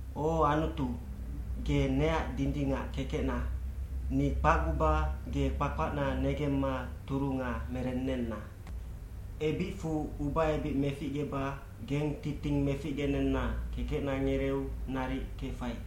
O Anutu, ge neac dindingac kekecna, ni kpacguba ge kpakpacna negemma turunga merennenna. Ebicfu ubaebic meficgeba geng titing meficgenenna kekecna ngereeu naric kefai.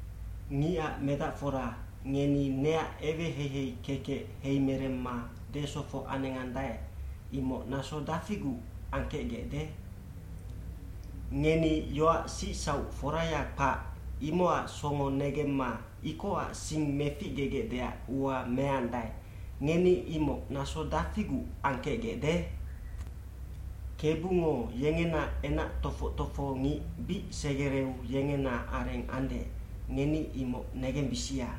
Ngicac medacfora, ngeni neac eweheihei kekec heimeremma desofoc anengandae, imoc naso dafiguc angkecgecde? Ngeni yoac sicsauc foraya kpac, imocac songo negemma ikocac sing meficgegecdeac ua meandae, ngeni imoc naso dafiguc angkecgecde? Kebungo yengena enac tofoc tofohongic bic segereu yengena areng ande, ngeni imoc negembisia.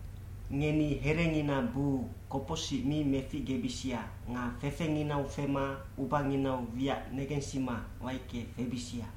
cNgeni herengina buu kopocsic mi meficgebisia nga fefenginau fema ubanginau wiac negensima waicke febisia.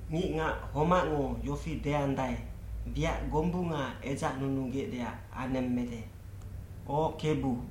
Ngicngac homacngo yofi deandae, “Wiac gombunga edzacnunugecdeac anemmede. O Kebu,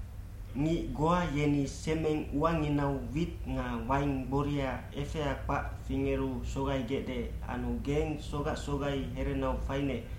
Ngic goa yeni semeng uanginau wit nga waing gboria efea kpac fingeru sogaigecde anu geng sogac sogai herenau fainec,